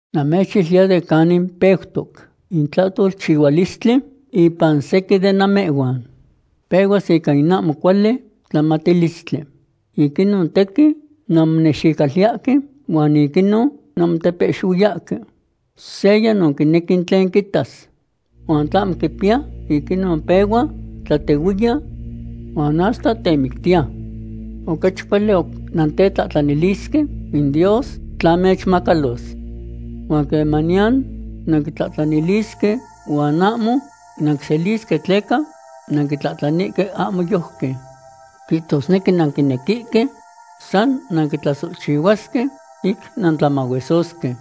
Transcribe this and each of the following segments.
Namechiluiya de canin peutoc in tlahtolchihualistli ipan sequin de namehhuan. Pehuas ica in ahmo cuali tlamatilistli. Ic inon tequin nanmonexicoliyahque huan ic inon nanmotepehxihuiyahque. Seya no quinequi in tlen quitas. Huan tla ahmo quipiya, ic inon pehua tlatehuiya huan hasta temictiya. Ocachi cuali oc nantetlahtlanilisque in Dios tla mechmacalos. Huan quemaniyan nanquitlahtlanisque, huan ahmo nanquiselisque tleca nanquitlahtlanihque ahmo yojqui. Quihtosnequi nanquinequihque san nanquitlasohchihuasque ic nantlamahuesosque.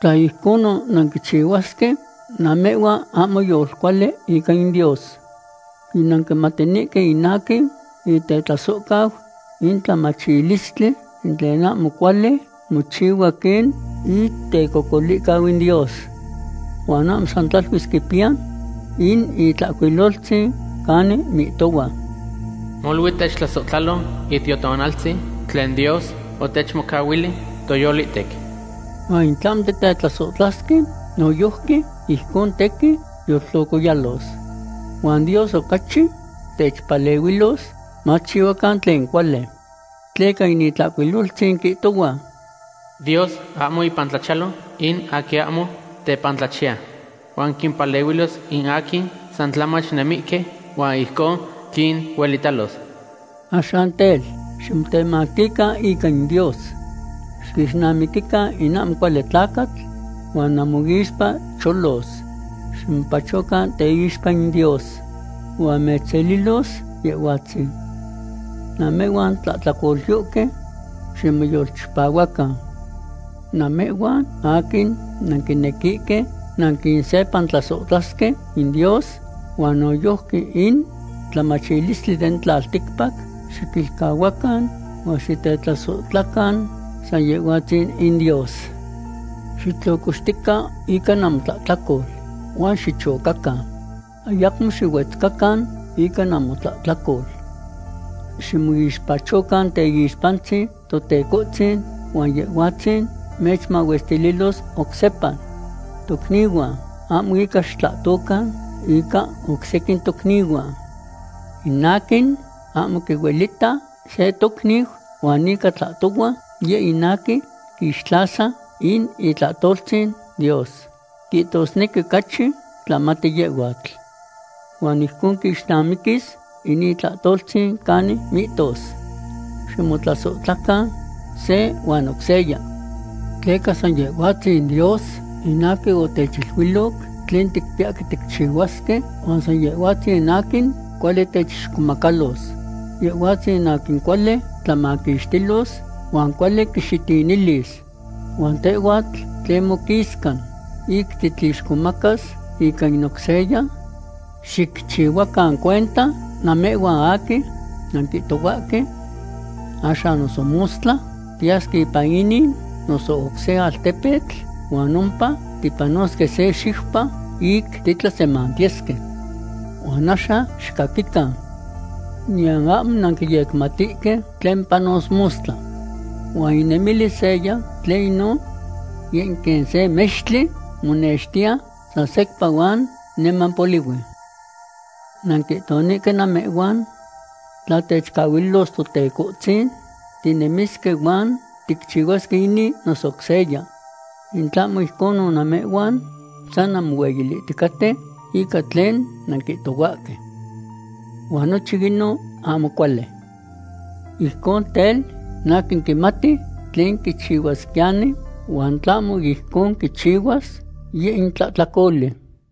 Tla ijconon nanquichihuasque, namehhuan ahmo yolcuali ica in Dios. Yinanquimatinihque in aquin itetlasohcau in tlamachilistli in tlen ahmo cuali mochihua quen itecocolihcau in Dios. Huan ahmo san tlaluis quipiya in Itlahcuiloltzin canin mihtohua: “Molui techtlasohtlalo Itiotonaltzin tlen Dios otechmocahuili toyolihtec.” Huan in tlahmo titetlasohtlasque noyojqui, ijcon tequin yoltlocoyalos. Huan Dios ocachi techpalehuilos maticchihuacan tlen cuali. Tleca in Itlahcuiloltzin quihtohua: “Dios ahmo ipan tlachiyalo in aquin ahmo tepantlachiya.” Huan quimpalehuilos in aquin san tlamach nemihque huan ijcon quinuelitalos. Axan tel, ximotemactican ica in Dios. Xiquixnamiquican in ahmo cuali tlacatl, huan namoixpa cholos. Ximopachocan teixpa in Dios huan mechselilos Yehhuatzin. Namehhuan tlahtlacolyohque, ¡ximoyolchipahuacan! Namehhuan aquin nanquinequihque nanquinsepantlasohtlasque in Dios huan noyojqui in tlamachilistli den tlalticpac, ¡xiquilcahuacan huan xitetlasohtlacan san Yehhuatzin in Dios! ¡Xitlocoxtican ica namotlahtlacol, huan xichocacan! Ayacmo xihuetzcacan ica namotlahtlacol. Ximoixpachocan teyixpantzin Totecohtzin huan Yehhuatzin mechmahuestililos oc sepa. Tocnihuan, ahmo ica xitlahtocan ica oc sequin tocnihuan. In aquin ahmo quihuelita se tocniu huan ica tlahtohua, yeh in aquin quixtlasa in itlahtoltzin Dios; quihtosnequi ocachi tlamati yehhuatl. Huan ijcon quixnamiquis in itlahtoltzin canin mihtos: “Ximotlasohtlacan se huan oc seya.” Tleca san Yehhuatzin Dios in aquin otechiluiloc tlen ticpiyahque ticchihuasque huan san Yehhuatzin aquin cuali techixcomacalos. Yehhuatzin aquin cuali tlamaquixtilos huan cuali quixitinilis. Huan tehhuatl; ¿tlen moquisca, ic titlixcomacas ica in oc seya? Xicchihuacan cuenta, namehhuan aquin nanquihtohuahque: “Axan noso mostla tiyasque ipan inin noso oc se altepetl huan ompa tipanosque se xiupa ic titlasemantiyesque.” Huan axan xicaquican; niyan ahmo nanquiyecmatihque tlen panos mostla. ¿Huan inemilis seya; tlen inon? Yeh in quen se mextli monextiya san secpa huan niman polihui. Nanquihtonihque namehhuan: “Tla techcahuililos Totecohtzin, tinemisque huan ticchihuasque inin noso oc seya.” In tlahmo ijconon namehhuan san nanmohueyilihticaten ica tlen nanquihtohuahque. Huan nochin inon ahmo cuali. Ijcon tel, in aquin quimati tlen quichihuasquiyani, huan tlahmo ijcon quichihuas, yeh in tlahtlacoli.